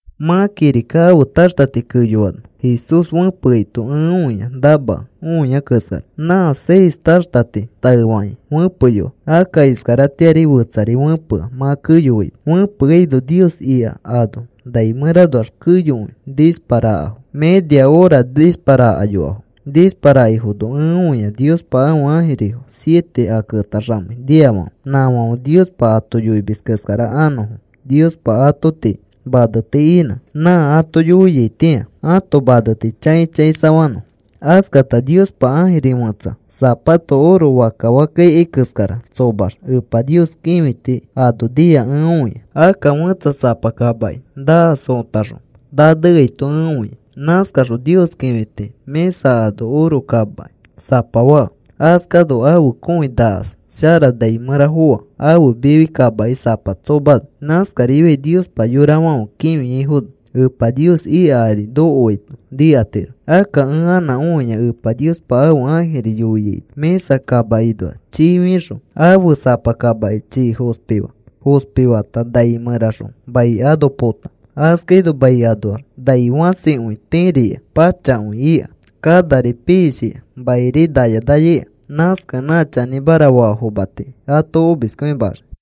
Mã kirika ãfe taxtati keyoano Jesús fẽpeaito ẽ õia namakẽ õiai keskara. Nã seis taxtati taefakĩ fẽpeyoa. Akka iskaratĩari fetsari fẽpea mã keyoaino. Fẽpeano Nios ika ano nai mẽranoax keyokõi nishparakafo. Media hora nishparakayoafo. Nishparakaifono ẽ õia Niospa ãfe ãjirifo siete a ketaxamei niafãfe, nãfãfe Niospa ato yoimis keskara anõfo. Niospa ato tii maneti inã nã ato yoiaitĩa ãto maneti chãi chãisafanõfo. Askata Niospa ãjiri fẽtsa sapa oro fakka fakka ikai keskara tsomax Epa Nios kĩfiti ano nia ẽ õia. Akka fẽtsa sapa kamaki nakas otaxõ naneaito ẽ õia. Nãskaxõ Nios kĩfiti mĩsa ano oro kamaki sapa faa. Askano ãfe kõi nakas shara nai mẽra foa ãfe mifi kamaki sapa tsomano. Nãskarifiai Niospa yorafãfe kĩfiaifono Epa Nios ika ari nokoaito nikatiro. Akka ẽ anã õia Epa Niospa ãfe ãjiri yoiaino, mĩsa kamakinoa chii fixõ ãfe sapa kamaki chii fospi faa. Fospi fata nai mẽraxõ mai ano pota. Askaino mai anoax nai fãsikõi tiiri ika pachakõi ika, kanari piishika mairi naya naya ika. Nãskakẽ nã chanĩmara faafoma tii ato omiskõimaxii.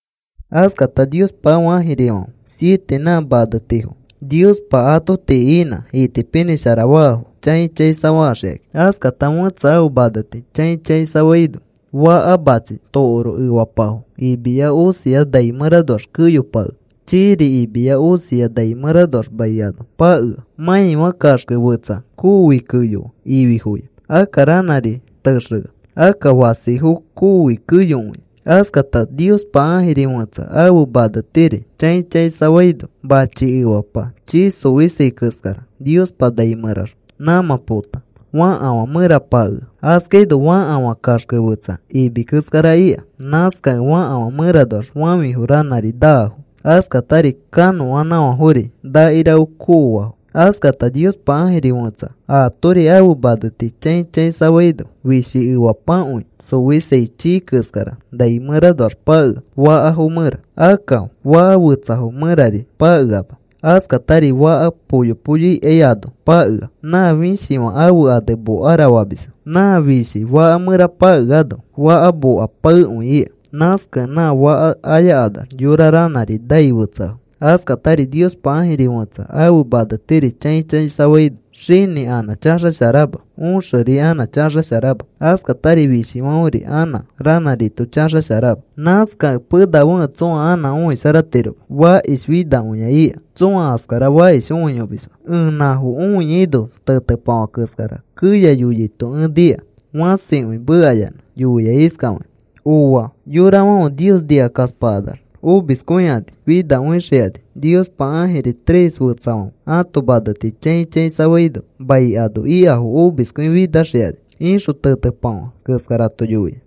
Askata Niospa ãfe ãjirifãfe siete nã manetifo Niospa ato tii inã itipinĩsharafaafo chãi chãisafaxikãki. Askata fẽtsa ãfe maneti chãi chãisafaino faka matsi tokoro efapafo imia osia nai mẽranoax keyopakea. Chiiri imiya osia nai mẽranoax mai ano pakea. Mãifã kaxke fetsa koofi keyoa ififoya. Akka ranãri texea. Akka fasifo kooi keyokõia. Askata Niospa ãjiri fẽtsa ãfe manetiri chãi chãisafaino machi efapa chii xoisai keskara Niospa nai mẽraxõ nãmã pota. Fakafã mẽra pakea. Askaino fakafã kaxke fetsa imi keskara ika. Nãskakẽ fakafã mẽranoax fafĩfo ranãri naafo. Askatari kanõanãfãfori ranãri kooafo. Askata Niospa ãjiri fẽtsa atori ãfe maneti chãi chãisafaino fishi efapakõi xofisai chii keskara nai mẽranoax pakea fakafo mẽra. Akka faka fetsafo mẽrari pakeama. Askatari faka poyo poyo ikai ano pakea. Nã fishifã ãfe ane Mokara famisfo. Nã fishi faka mẽra pakeano, faka moka paekõi ika. Nãskakẽ nã faka ayakanax yorafo ranãri nai fetseafo. Askatari Niospa ãjiri fẽtsa ãfe manetiri chãi chãisafaino xinĩ anã chaxasharama. Õxeri anã chaxasharama. Askatari fishifãferi anã ranãrito chaxasharama. Nãskakẽ penafekẽ tsõa anã õisharatiroma. Fakish finakõia ika. Tsõa askara fakish õiyomisma. Ẽ nãfo õiaino tetepafã keskara keya yoyaito ẽ nika. Fãsikõi mekayanã yoia iskafakĩ: “¡Ooa! Yorafãfe Nios nikakaspakanax omiskõikani finakõixikani. Niospa ãjiri tres fetsafãfe ãto maneti chãi chãisafaifono mai ano ikafo omiskõifinaxikani,” ixõ tetepafã keskarato yoia.